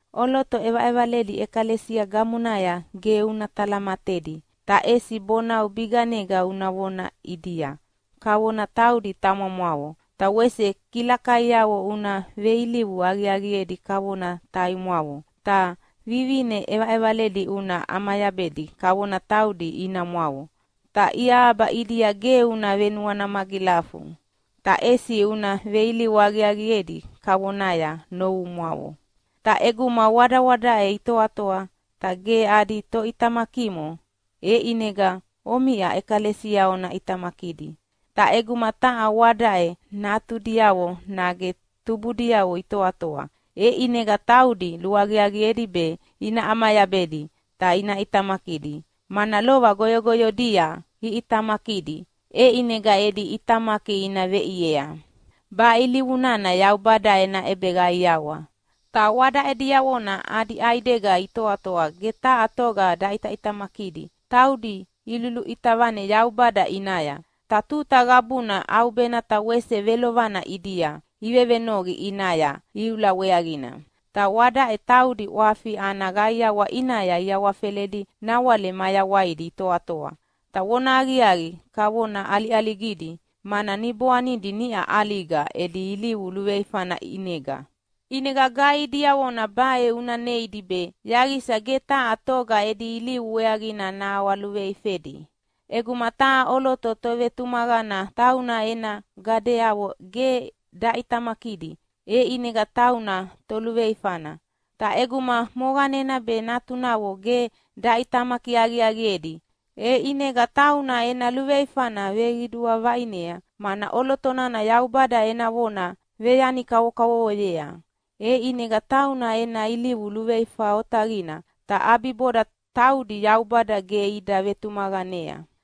ʼOloto ʼevaʼevaledi ʼekalesia gamonaya ge una talamatedi, ta ʼesi bonau biganega una vona ʼidia, kavona taudi tamamwavo. Ta wese kilakaiavo una veilivu aqiaqiedi kavona taimwavo. Ta vivine ʼevaʼevaledi una ʼamayabedi kavona taudi inamwavo, ta iahaba ʼidia ge una venuana magilafu, ta ʼesi una veilivu aqiaqiedi kavonaya novumwavo. Ta ʼeguma wadawadaʼe itoatoa ta ge adi toʼitamakimo, e ʼinega omiʼa ʼekalesia ona ʼitamakidi. Ta ʼeguma taha wadaʼe natudiavo nage tubudiavo itoatoa, e ʼinega taudi luaqiaqiedi be ina ʼamayabedi ta ina ʼitamakidi, mana lova goyogoyodia iʼitamakidi, e ʼinega edi ʼitamaki ina veʼiea. Baʼe ilivu nana Yaubada ena ʼebeqaiawa. Ta wadaʼe diavona adi ʼaidega itoatoa ge taha toga daʼitamakidi taudi iluluʼita vane Yaubada ʼinaya, ta tuta qabuna ʼaubena ta wese velovelovana ʼidia ivevenoqi ʼinaya iula weaqina. Ta wadaʼe taudi ʼwafi ana qaiawa ʼinaya iawafeledi nawale mayawaidi itoatoa, ta vonahaqiaqi kavona ʼaliʼaligidi mana niboanidi niʼa ʼaliga edi ilivu luveifana ʼinega. ʼInega gaihi diavona baʼe una neidi be yaqisa ge taha toga edi ilivu weaqina naʼawaluveifedi. ʼEguma taha ʼoloto tovetumaqana tauna ena gadeavo ge daʼitamakidi, e ʼinega tauna toluveifana. Ta ʼeguma moqanena be natunavo ge daʼitamaki aqiaqiedi, e ʼinega tauna ena luveifana veqidua vaʼine, mana ʼoloto nana Yaubada ena vona veyani kavokavovoyea, e ʼinega tauna ena ilivu luveifa otaqina, ta ʼabiboda taudi Yaubada ge ida vetumaqanea.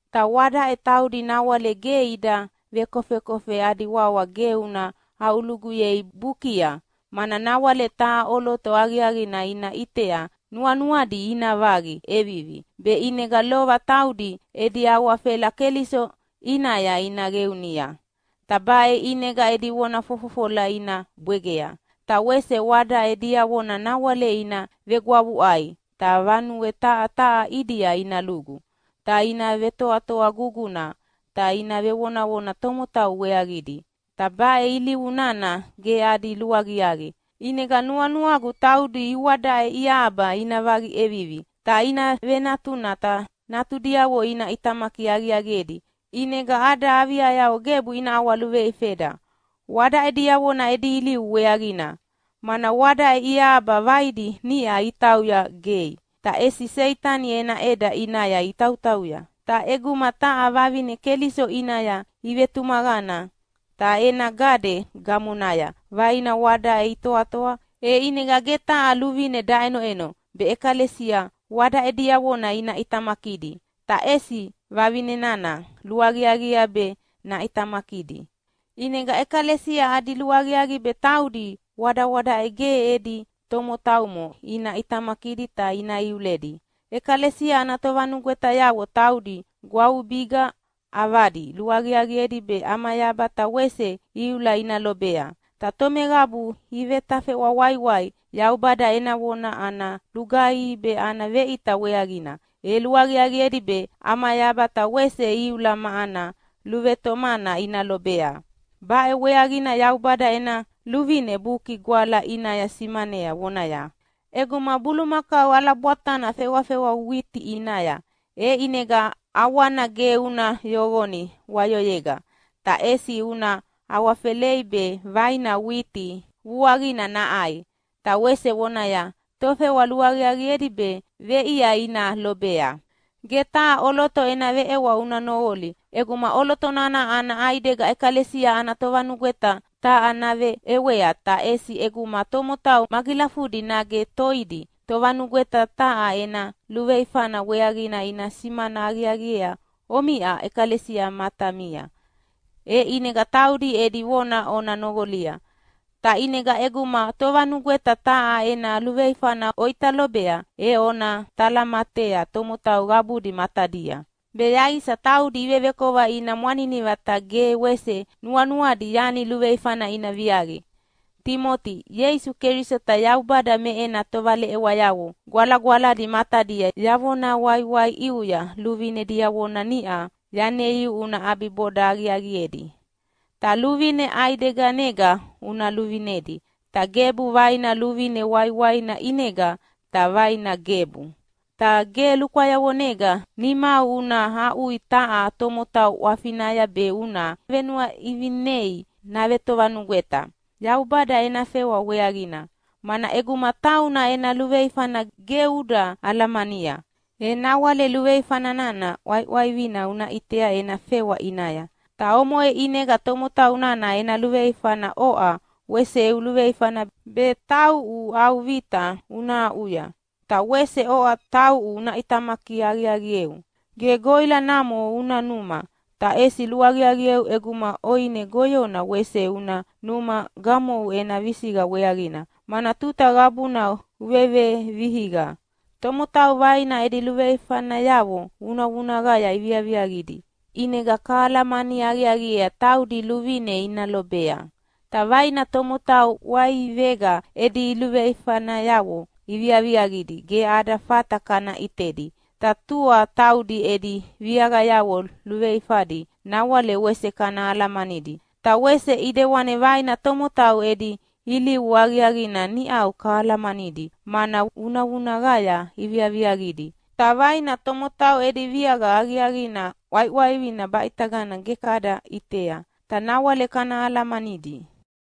Ta wadaʼe taudi nawale ge ida vekofekofe adi wawa ge una aʼuluguyei bukia, mana nawale taha ʼoloto aqiaqina ina ʼitea nuanuadi ina vaqi ʼevivi, be ʼinega lova taudi edi awafela Keliso ʼinaya ina qeunia. Ta baʼe ʼinega edi vona fofofola ina bwegea. Ta wese wadaʼe diavona nawale ina vegwavuʼai ta vanue taha taha ʼidia ina lugu, ta ina vetoatoa guguna ta ina vevonavona tomotau weaqidi. Ta baʼe ilivu nana ge adi luaqiaqi. ʼInega nuanuagu taudi iwadaʼe iahaba ina vaqi ʼevivi, ta ina venatuna ta natudiavo ina ʼitamaki aqiaqiedi, ʼinega ada aviayavo gebu ina ʼawaluveifeda wadaʼe diavona edi ilivu weaqina. Mana wadaʼe iahaba vaidi niʼa itauya gei, ta ʼesi Seitani ena ʼeda ʼinaya itautauya. Ta ʼeguma taha vavine Keliso ʼinaya ivetumaqana ta ena gade gamonaya vaina wadaʼe itoatoa, e ʼinega ge taha luvine daʼenoʼeno be ʼekalesia wadaʼe diavona ina ʼitamakidi, ta ʼesi vavine nana luaqiaqiea be naʼitamakidi. ʼInega ʼekalesia adi luaqiaqi be taudi wadawadaʼe ge edi tomotaumo ina ʼitamakidi ta ina iuledi. ʼEkalesia ana tovanugwetayavo taudi gwavubiga ʼavadi luaqiaqiedi be ʼamayaba ta wese iula ina lobea. Ta tomeqabu ivetafeʼwa waiwai Yaubada ena vona ana lugaihi be ana veʼita weaqina, e luaqiaqiedi be ʼamayaba ta wese iula ma ana luvetomana ina lobea. Baʼe weaqina Yaubada ena luvine Buki Gwala ʼinaya simanea vonaya, “ʼEguma bulumakau ʼalabwatana fewafewa witi ʼinaya, e ʼinega ʼawana ge una yoqoni wayoyega, ta ʼesi una awafelei be vaina witi vuaqina naʼai.” Ta wese vonaya, “Tofewa luaqiaqiedi be veʼia ina lobea.” Ge taha ʼoloto ena veʼewa una noqoli ʼeguma ʼoloto nana ana ʼaidega ʼekalesia ana tovanugweta taha naveʼewea. Ta ʼesi ʼeguma tomotau magilafudi nage toidi tovanugweta taha ena luveifana weaqina ina simana aqiaqiea omiʼa ʼekalesia matamia, e ʼinega taudi edi vona ona noqolia. Ta ʼinega ʼeguma tovanugweta taha ena luveifana oʼita lobea, e ona talamatea tomotau qabudi matadia, be yaqisa taudi ivevekova ina mwaniniva ta ge wese nuanuadi yani luveifana ina viaqia. Timoti, Ieisu Keliso ta Yaubada me ena tovaleʼewayavo gwalagwaladi matadia yavona waiwai ʼiuya luvine diavona niʼa yaneiu una ʼabiboda aqiaqiedi. Ta luvine ʼaideganega una luvinedi, ta gebu vaina luvine waiwaina ʼinega, ta vaina gebu. Ta ge lukwayavonega nimau una aʼui taha tomotau ʼwafinaya be una venuaʼivinei navetovanugweta Yaubada ena fewa weaqina. Mana ʼeguma tauna ena luveifana ge uda alamania, e nawale luveifa nana ʼwaiʼwaivina una ʼitea ena fewa ʼinaya. Ta omoʼe ʼinega tomotau nana ena luveifana oʼa wese eu luveifana be tauʼu au vita una aʼuya. Ta wese oʼa tauʼu una ʼitamaki aqiaqieu. Ge goʼila namo una numa, ta ʼesi luaqiaqieu ʼeguma ʼoine goyona wese una numa gamou ena visiqa weaqina, mana tuta qabuna uvevevihiqa. Tomotau vaina edi luveifanayavo vunavunaqaya iviaviaqidi ʼinega kahalamani aqiaqiea taudi luvine ina lobea. Ta vaina tomotau ʼwaivega edi luveifanayavo iviaviaqidi ge ada fata kana ʼitedi, ta tua taudi edi viaqayavo luveifadi nawale wese kana alamanidi. Ta wese ʼidewana vaina tomotau edi ilivu aqiaqina niʼau kahalamanidi mana vunavunaqaya iviaviaqidi, ta vaina tomotau edi viaqa aqiaqina ʼwaiʼwaivina baʼitagana ge kada ʼitea, ta nawale kana alamanidi.